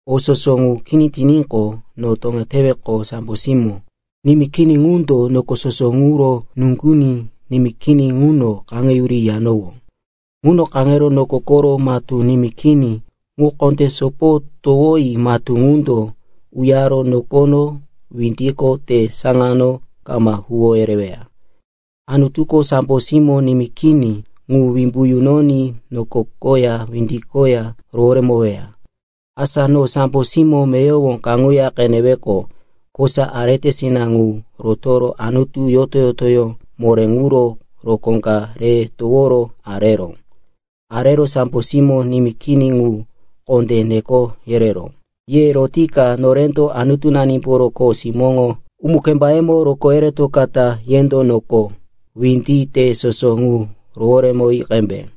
O soso ŋu kini tiníqo, no toŋeteroqo sambo simó nimí kini ŋundo noko soso ŋuro nuŋginí nimí kini ŋuno kaŋeyuri yiyanowó. Ŋuno kaŋero noko koro matú nimí kini ŋu kondé sopo towoyi matú ŋundo uyaro nokono, windiko, te saŋano kama huwo yereweya. Anutuko sambo simó nimí kini ŋu wimbu yunoní noko koya windi koya roworemoweya. Asa no sambo simó meyowo kaŋuya qeneweqo, kosa aretesina ŋu rotoro Anutu yoto-yotoyó moré ŋuro rokó ka re toworo areró. Arero sambo simó nimí kini ŋu kondé neko yereró, “Ye rotika norendo Anutunanimboro kho simóŋo umu-kembayemo rokó yeretokata yendo noko, windi, te soso ŋu roworemoyi qembe.”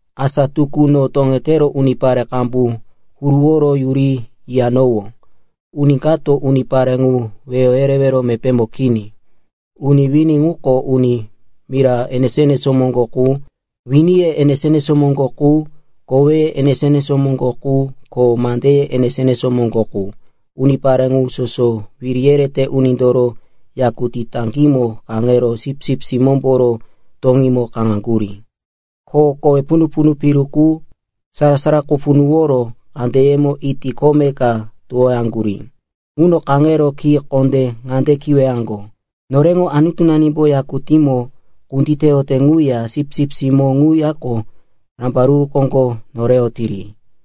Asa tukú no toŋetero unipare qambu huruworo yuri yiyanowó. Uni kato unipare ŋu weyo yerewero mepémo kini. Uni wini ŋuko uni mira enesó-enesó moŋgo qu, winiye enesó-enesó moŋgo qu, koweye enesó-enesó moŋgo qu ko mandeye enesó-enesó moŋgo qu. Unipare ŋu soso wiri yerete unindoro yakutí taŋgímo kaŋero Sipsip Simómboro toŋímo kaŋaŋgurí, ko kowe punu-punu piru qu, sara-sara qu punuworo kandeyemo iti kome ka towoyaŋgurí. Ŋuno kaŋero ki kondé ŋande kiweyaŋgo, “Noreŋo Anutunanimbo yakutímo kunditeyote ŋuya Sipsip Simó ŋuyako rambaruru koŋgo noreyotiri.”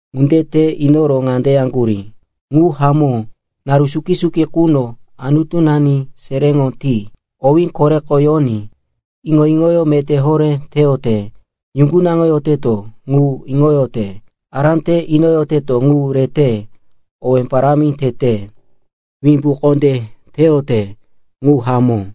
Ŋunde te inoro ŋande yaŋgurí, “Ŋu hamó. Naru suki-suki quno Anutunani seréŋo ti, owí koreko yoní, iŋo-iŋoyó meté horé teyote, yuŋgunaŋoyoteto ŋu iŋoyote, ará te inoyoteto ŋu rete, owe parámi tete, wimbu kondé teyote. Ŋu hamó.”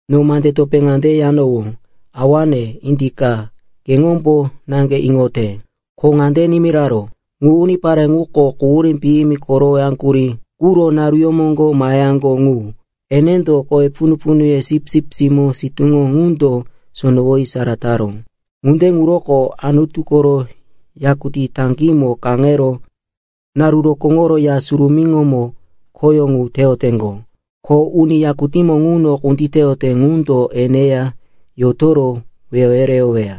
No mande topé ŋande yanowó, “Awane, indika, keŋombo naŋge iŋote.” Ko ŋande nimiraró, “Ŋu unipare ŋuko quhurí piyimi korowoyaŋgurí quro naruyó moŋgo maheyaŋgo ŋu. Enendo kowe punu-punuye Sipsip Simó sitúŋo ŋundo sonowoyi sara taró. Ŋunde ŋuroko “Anutu koro yakutí taŋgímo kaŋero naru rokóŋoro Ya Surumíŋomo khoyó ŋu teyoteŋgo. Ko uni yakutímo ŋuno kunditeyote ŋundo eneya yotoro wehe yereyoweya.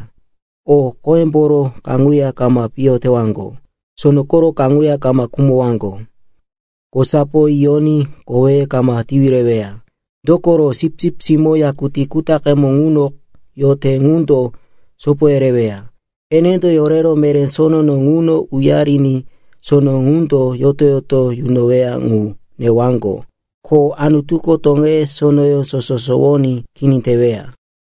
O qoyemboro kaŋuya kama piyo tewaŋgo, sono koro kaŋuya kama khumowaŋgo. Kosapo yiyoní koweye kama tiwi reweya. Dokoro, Sipsip Simó yakutí kutaqemo ŋuno yote ŋundo sopo yereyoweya. Enendo yorero meré sonono ŋuno uyariní sono ŋundo yoto-yoto yunoweya ŋu newaŋgo. Ko Anutuko toŋeye sonoyó soso sowoní kini teweya.”